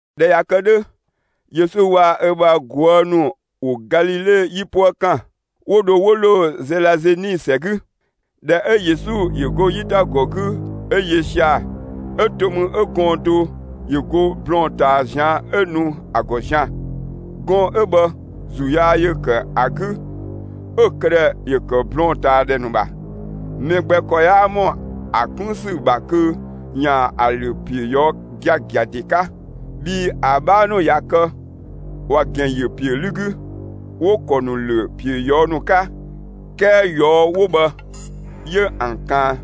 ꞊Dhɛ ꞊ya kë 'dhö, Yesu waa‑ ö bha ꞊guë' ‑nu ‑wo Galile 'yipuë ‑kan, 'wo dho 'wo ‑lo Zelazeni ‑sɛ 'gü. ꞊Dhɛ 'ö Yesu ‑yö go 'yitagɔ 'gü 'ö yö sia‑ 'ö to mü 'ö gɔɔn‑ do ‑yö go blɔɔn‑ ꞊taa ꞊zian' 'ö nu ‑a ‑gɔ zian‑. Gɔɔn‑ 'ö bhë ‑zuu yaa ‑yö ‑kë ‑a 'gü 'ö‑ këdhɛ ‑yö ‑kë blɔɔn‑ ꞊taa ‑dhɛ ‑nu ‑bha. Mɛ gbɛ ‑kɔ 'yaa ‑mɔ ‑a 'kun ‑sü ‑bha kö ‑yaan ‑a ‑lö ‑piö ꞊yɔɔ' giagia ‑de 'ka. Bhii ‑a 'bhaa ‑nu ꞊ya kë, ‑wa ‑gɛn ‑yö ‑piö 'lü 'gü, 'wo‑ ‑kɔ ‑nu ‑lö ‑piö ꞊yɔɔ' ‑nu 'ka. 'Kɛɛ ꞊yɔɔ' 'wo bhë 'yö ‑an ‑kaan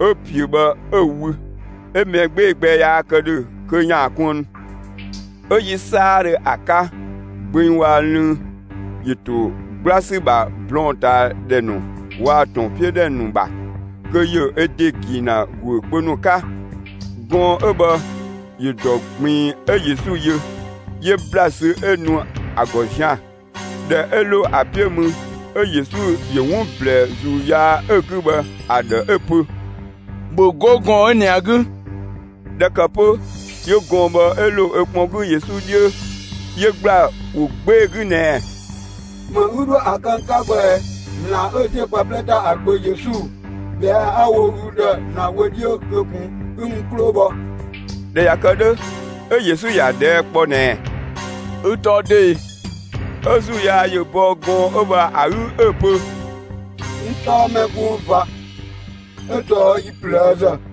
'ö ‑piö bhë 'ö‑ wü. 'Ö mɛ 'gbee‑ gbɛ yaa kë ‑dhö kö ‑yaan kuënnu. 'Ö yi 'saadhö ‑a 'ka, gbeng waa‑ lënng ‑yö ‑to 'gbla ‑sü ‑bha blɔɔn‑ ꞊taa ‑dhɛ ‑nu waa‑ ‑tɔn 'piö ‑dhɛ ‑nu ‑bha, kö ‑yö ö ‑de ‑gi ‑na ‑guö kpö ‑nu 'ka. Gɔɔn‑ 'ö bhë ‑yö ‑dɔ ꞊gbiin 'ö Yesu yö. 'Yö ‑bla sü 'ö nu ‑a ‑gɔ zian‑. ꞊Dhɛ 'ö ‑lo ‑a 'piö mü 'ö Yesu ‑yö 'wun ꞊blɛɛ ‑zuu yaa 'ö‑ 'gü bhë ‑a ‑dhë 'ö‑ pö: «‑Bhö 'go gɔɔn‑ 'ö ꞊nɛ ‑a 'gü!» ꞊Dhɛ ‑kë 'pö 'yö gɔɔn‑ bhë 'yö ‑lo ö kpɔn 'gü Yesu 'dhiö, 'yö ‑gbla ‑wo 'gbee‑ 'gü ꞊nɛɛ: «‑Më 'ü 'dhoë‑ ‑a kë n 'ka bhë ꞊ɛ, ‑Zlan 'ö ‑ziö pë 'plɛ ‑ta ‑a Gbö Yesu? ꞊Bhɛa'‑ 'a‑ wo ü ‑dhë ‑Zlan wö 'dhiö kö ꞊kun 'ö 'ü n 'klo‑ bhɔ!» ꞊Dhɛ ꞊ya kë 'dhö, 'ö Yesu ‑ya ꞊dhɛɛ' kpɔ ꞊nɛɛ: «Ü tɔɔ dö ꞊e?» 'Ö ‑zuu yaa ‑yö bɔ gɔɔn‑ 'ö bhë ‑a 'gü, 'ö‑ pö: «N tɔɔ «Mɛ gbung ꞊va» 'ö tɔɔ yi ꞊plëëzë.»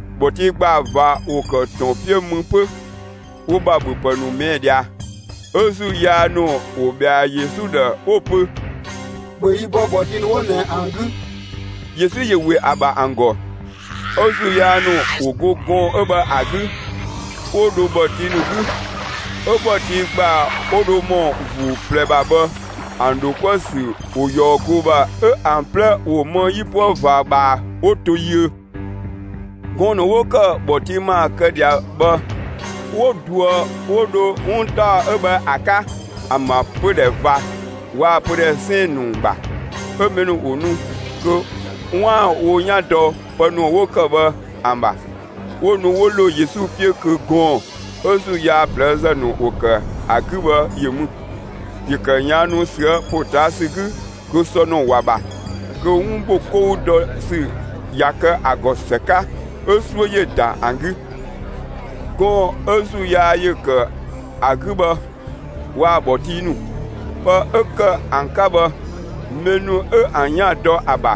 ‑Bhɔtii ‑gbaa ꞊va ‑wo ‑kë ‑tɔn 'piö mü 'pö, wo ‑bha ‑bhöpë ‑nu ꞊mɛɛ' ꞊dhia. 'Ö ‑zuu yaa ‑nu ‑wo ꞊bhɛa Yesu ‑dhë, 'wo‑ pö: «‑Bhö yi bɔ ‑bhɔtii ‑nu 'wo ꞊nɛ ‑an 'gü!» Yesu ‑yö ‑we ‑a ‑bha ‑an ‑gɔ, 'ö ‑zuu yaa ‑nu ‑wo go gɔɔn‑ 'ö bhë ‑a 'gü, 'wo dho ‑bhɔtii ‑nu 'gü. 'Ö ‑bhɔtii ‑gbaa 'wo dho ‑mɔ ‑vuu ꞊plɛ ‑bha bhë ‑an ‑dho 'kuë‑ ‑sü ‑wo ꞊yɔɔ goo ‑bha 'ö ‑an 'plɛ ‑wo më 'yipuë ꞊va ꞊bhaa 'wo to yiö. Gɔɔn‑ ‑nu 'wo kë ‑bhɔtii ‑maa kë ꞊dhia bhë 'wo ꞊duë 'wo dho 'wun ‑taɔ 'ö bhë ‑a 'ka ‑an ‑bha pödhɛ ꞊va waa‑ pödhɛ 'sɛɛn‑ ‑nu ‑bha. 'Ö mɛ ‑nu ‑wo nu kö 'waan‑ wo 'yan dɔ pë ‑nu 'wo ‑kë bhë ‑an ‑bha. 'Wo nu 'wo ‑lo Yesu 'piö kö gɔɔn‑ 'ö ‑zuu yaa ꞊plëëzë ‑nu ‑wo ‑kë ‑a 'gü bhë ‑yö mü. ‑Yö ‑kë ꞊yaannu ꞊süë' ‑potaasü 'gü kö sɔ ‑nu ‑wa ‑bha, kö 'wun ‑bho 'kou dɔ ‑sü ꞊ya kë ‑a ‑gɔ ‑së 'ka. 'Ö 'suö ‑yö ‑da ‑an 'gü. Gɔɔn‑ 'ö ‑zuu yaa ‑kë ‑a 'gü bhë waa‑ ‑bhɔtii ‑nu, pë 'ö ‑kë ‑an 'ka bhë, mɛ ‑nu 'ö ‑an 'yan dɔ ‑a ‑bha,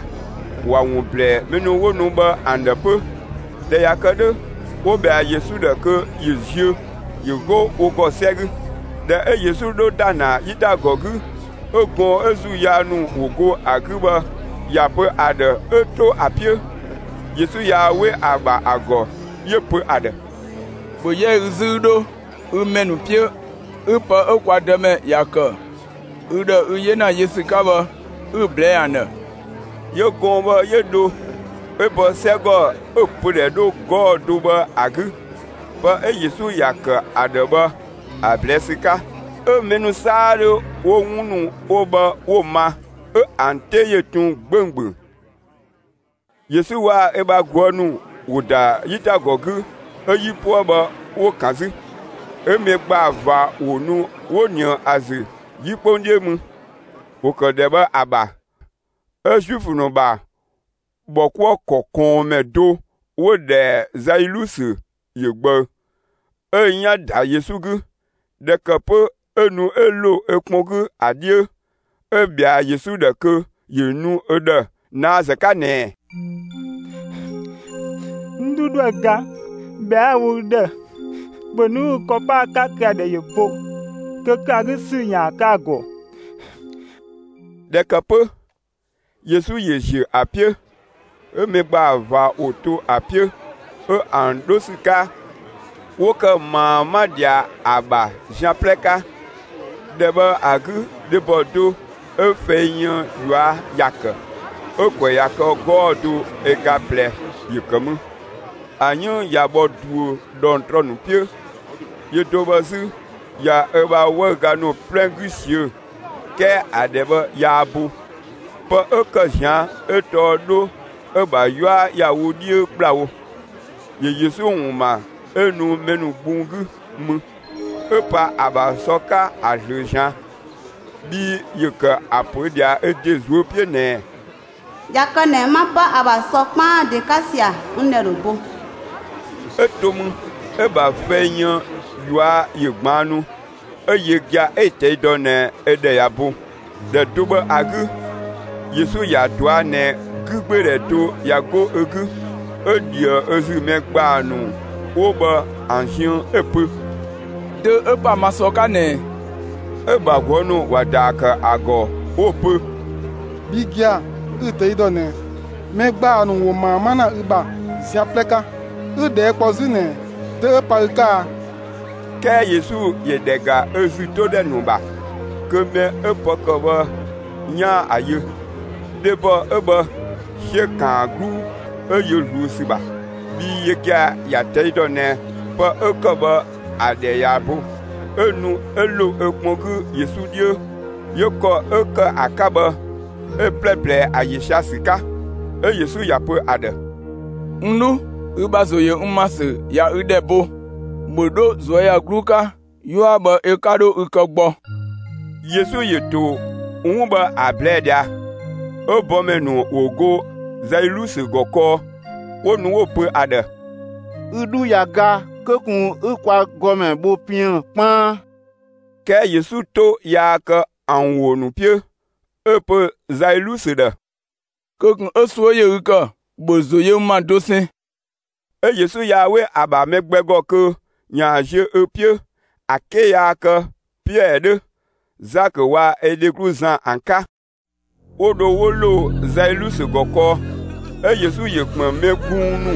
‑wa ‑wun ꞊blɛɛ mɛ ‑nu 'wo nu bhë ‑an ‑dhë 'pö. ꞊Dhɛ ꞊ya kë 'dhö, 'wo ꞊bhɛa Yesu ‑dhë kö ‑yö ziö, ‑yö 'go wo ‑gɔ 'sɛ 'gü. ꞊Dhɛ 'ö Yesu 'dho ‑da ‑na 'yitagɔ 'gü, 'ö gɔɔn‑ 'ö ‑zuu yaa ‑nu ‑wo go ‑a 'gü bhë ‑ya pö ‑a ‑dhë 'ö 'to ‑a 'piö. Yesu yaa 'we ‑a ‑bha ‑a ‑gɔ, 'yö‑ pö ‑a ‑dhë: «‑Bhö 'yɛ ü 'zü, 'ü 'dho ü ‑mɛ ‑nu 'piö, 'ü pë 'ö kwa Dëmɛ ‑ya ‑kë ü ‑dhë ü 'yena yö ‑sü 'ka bhë, 'ü‑ ꞊blɛɛ'‑ ‑an ‑dhë!» 'Yö gɔɔn‑ bhë 'yö dho, 'ö bɔ 'sɛgɔ 'ö‑ pödhɛ 'dhö 'gɔɔ‑ do bhë ‑a 'gü, pë 'ö Yesu ‑ya ‑kë ‑a ‑dhë bhë ‑a ꞊blɛɛ' ‑sü 'ka. 'Ö mɛ ‑nu 'saadhö 'wo 'wun ‑nu 'wo bhë 'wo‑ ma, 'ö ‑an 'te ‑yö tun 'gbönggböng. Yesu waa‑ ö bha ꞊guë' ‑nu ‑wo ‑da 'yitagɔ 'gü 'ö 'yipuë bhë 'wo‑ ‑kan 'zü. 'Ö mɛ ‑gbaa ꞊va ‑wo nu 'wo ꞊nië ‑a ‑zü 'yi 'kpong 'dhiö mü. ‑Wo ‑kë ‑dhɛ bhë ‑a ‑bha, 'ö Zuifö ‑nu ‑bha ‑bhɔkuëkɔ ꞊kɔɔnmɛ do 'wo‑ ‑dhɛ Zailusö ‑yö ꞊gbëü; 'ö‑ 'yan ‑da Yesu 'gü. ꞊Dhɛ ‑kë 'pö 'ö nu 'ö ‑lo ö kpɔn 'gü ‑a 'dhiö, 'Ö‑ ꞊bhɛa Yesu ‑dhë kö ‑yö nu ö ‑dhë ꞊naazë 'ka ꞊nɛɛ: «N 'dhu 'ö 'dhoë‑ ga, ꞊bhɛa'‑ 'a‑ wo ü ‑dhë, ‑bhö nu 'ü ü ‑kɔ pa ‑a 'ka kö ‑a ‑dhɛ ‑yö bo, kö ‑kë ‑a 'gü ‑sü ‑yaan kë ‑a ‑gɔ!» ꞊Dhɛ ‑kë 'pö, Yesu ‑yö ‑ziö ‑a 'piö. 'Ö mɛ ‑gbaa ꞊va ‑wo ‑to ‑a 'piö, 'ö ‑an 'dho ‑sü 'ka, 'wo ‑kë ꞊maa 'ma ꞊dhia ‑a ‑bha zian 'plɛ 'ka. ‑Dhɛ bhë ‑a 'gü dhebɔ do 'ö fɛi yën ꞊yua' ‑ya ‑kë 'ö ‑kwɛ ‑ya kë 'gɔɔ‑ do ö ga ꞊plɛ ‑yö ‑kë mü. ‑A 'yënng ‑ya bhɔ ꞊duö ꞊dhɔngtrɔ ‑nu 'piö, yö do bhë 'zü, ‑ya ö bha 'wëüga ‑nu 'plɛ 'gü ꞊siö' 'kɛɛ ‑a ‑dhɛ bhë yaa bo. Pë 'ö ‑kë ꞊zian' 'ö tɔɔ 'dho 'ö‑ ‑bha 'yua ‑ya wo 'dhiö ‑kplawo. ‑Yö Yesu ‑wun ‑ma 'ö nu mɛ ‑nu gbung 'gü mü, 'ö pa ‑a ‑bha sɔ 'ka ‑a ꞊zlöö ꞊zian'. Bhii ‑yö ‑kë ‑a pö ꞊dhia ö ‑de ꞊zuö' 'piö ꞊nɛɛ: «꞊Ya kë ꞊nɛ 'ma 'pa ‑a ‑bha sɔ 'kpaan ‑de 'ka ꞊sia, n ꞊dhɛ ‑dho bo.» 'Ö to mü, 'ö‑ ‑bha fɛi yën ꞊yua' ‑yö ꞊gbaannu, 'ö yö gia‑ 'ö‑ ꞊tɛi' dɔ ꞊nɛ ö ‑dhɛ ꞊ya bo. ‑Dhɛ do bhë ‑a 'gü, Yesu ‑ya ꞊dɔa' ꞊nɛ 'gügbeedhɛ do ꞊ya 'go ö 'gü. 'Ö ꞊dhië ö ‑zü mɛ ‑gbaa ‑nu 'wo bhë ‑an ziën, 'ö‑ pö: «Dö 'ö pa ma sɔ 'ka ꞊nɛ ꞊ɛ?» 'Ö‑ ‑bha ꞊guë' ‑nu ‑wa ‑daa ‑kë ‑a ‑gɔ 'wo‑ pö: «Bhi gia‑, 'ü‑ ꞊tɛi' ‑dɔ ꞊nɛ, mɛ ‑gbaa ‑nu ‑wo ꞊maa 'ma ‑na ü ‑bha zian 'plɛ 'ka, 'ü ꞊dhɛɛ' kpɔ 'zü ꞊nɛ dö 'ö pa ü 'ka a?» 'Kɛɛ Yesu ‑yö ‑dhɛ ‑ga ö ‑zü 'to ‑dhɛ ‑nu ‑bha kö mɛ 'ö pë ‑kë bhë 'yaan‑ ‑a yö. Dhebɔ 'ö bhë 'siö‑ ‑kaan ‑a 'gluu 'ö yö ꞊zluun ‑sü ‑bha, bhii yö gia‑ ‑ya ꞊tɛi' dɔ ꞊nɛ pë 'ö ‑kë bhë ö ‑dhɛ ꞊ya bo. 'Ö nu 'ö ‑lo ö kpɔn 'gü Yesu 'dhiö, 'yö ‑kɔ 'ö ‑kë ‑a 'ka bhë 'ö‑ 'plɛ ꞊blɛɛ, ‑a ‑yö sia‑ ‑sü 'ka. 'Ö Yesu ‑ya pö ‑a ‑dhë: «N 'dhu, ü ‑bha ‑zo ‑yö n ‑ma ‑sü ꞊ya ü ‑dhɛ bo, ‑bhö 'dho ꞊zuöyagluu 'ka; 'yua bhë ö 'ka 'dho ü kë gbɔ!» Yesu ‑yö ‑to 'wun bhë ‑a ꞊blɛɛ' ꞊dhia, 'ö bɔmɛ ‑nu ‑wo ‑go Zailusö ‑gɔ kɔɔ, 'wo nu 'wo‑ pö ‑a ‑dhë: «Ü 'dhu 'yan ga; kö ꞊kun 'ü kwa ‑gɔmɛ bho piën‑ 'kpaan!» 'Kɛɛ Yesu 'to yaa kë ‑an ‑wo ‑nu 'piö, 'ö‑ pö Zailusö ‑dhë: «Kö ꞊kun 'ö 'suö ‑yö ü ‑kë, ‑bhö ‑zo yö n ‑ma dosɛn!» 'Ö Yesu yaa 'we ‑a ‑bha mɛ gbɛ ‑gɔ kö ‑yaan ziö ö 'piö ‑a 'ke yaa kë Piɛɛ 'dhö, Zakö waa‑ ö dheglu Zan ‑an 'ka. 'Wo dho 'wo ‑lo Zailusö ‑gɔ kɔɔ. 'Ö Yesu ‑yö ‑kpën mɛ gbung ‑nu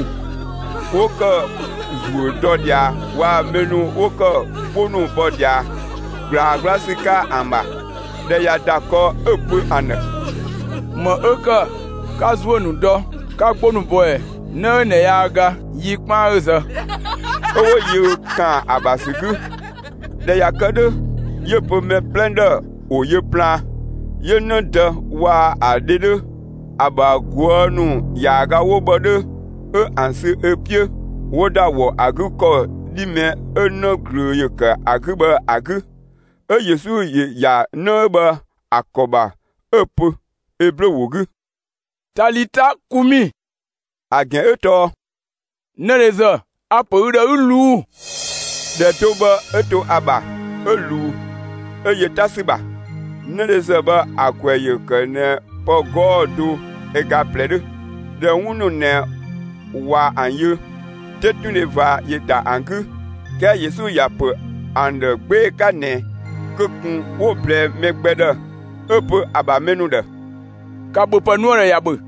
'wo ‑kë ‑zuö dɔ ꞊dhia waa‑ mɛ ‑nu 'wo ‑kë 'gbo ‑nu bɔ ꞊dhia ꞊gblaa 'gbla ‑sü 'ka ‑an ‑bha. ꞊Dhɛ ꞊ya ‑da kɔɔ 'ö‑ pö ‑an ‑dhë: «‑Më 'ö ‑kë 'ka ‑zuö ‑nu dɔ, 'ka 'gbo ‑nu bɔ ꞊ɛ? 'Në 'ö ꞊nɛ yaa ga, yi 'kpaan 'ö‑ zë.» 'Ö 'wo yö ‑kaan ‑a ‑bha ‑sü 'gü. ꞊Dhɛ ꞊ya kë 'dhö, 'yö‑ pö mɛ 'plɛ ‑dhë ‑wo yö plaan, 'yö 'në dë waa‑ ‑a dhe 'dhö, ‑a ‑bha ꞊guë' ‑nu ‑yaaga 'wo bhë 'dhö, 'ö ‑an sü ö 'piö, 'wo ‑da ‑wɔ ‑a 'gü ‑kɔ 'dhi mɛ 'ö 'në ꞊glöö ‑yö ‑kë ‑a 'gü bhë ‑a 'gü. 'Ö Yesu ‑yö ‑ya 'në 'ö bhë ‑a ‑kɔ ‑bha 'ö‑ pö Eblö ‑wo 'gü: «Talita kumi!» ‑A ‑gɛn 'ö tɔɔ: «'Nëdhezë, a‑ ‑pö ü ‑dhë, 'ü ꞊luu'‑!» ‑Dhɛ do bhë 'ö to ‑a ‑bha, 'ö ꞊luu 'ö yö 'ta ‑sü ‑bha. ('Nëdhezë bhë ‑a ‑kwɛ ‑yö ‑kë ꞊nɛ pë 'gɔɔ‑ do ö ga ꞊plɛ 'dhö.) ꞊Dhɛ 'wun ‑nu ꞊nɛ ꞊wa ‑an yö, 'tetundhe ꞊va ‑yö ‑da ‑an 'gü. 'Kɛɛ Yesu ‑ya ‑pö ‑an ‑dhë 'gbee‑ 'ka ꞊nɛ kö ꞊kun 'wo‑ ꞊blɛɛ mɛ gbɛ ‑dhë, 'ö‑ pö ‑a ‑bha mɛ ‑nu ‑dhë: «‑Ka ‑bhöpë nu ‑a ‑dhë, ‑ya ‑bhö!»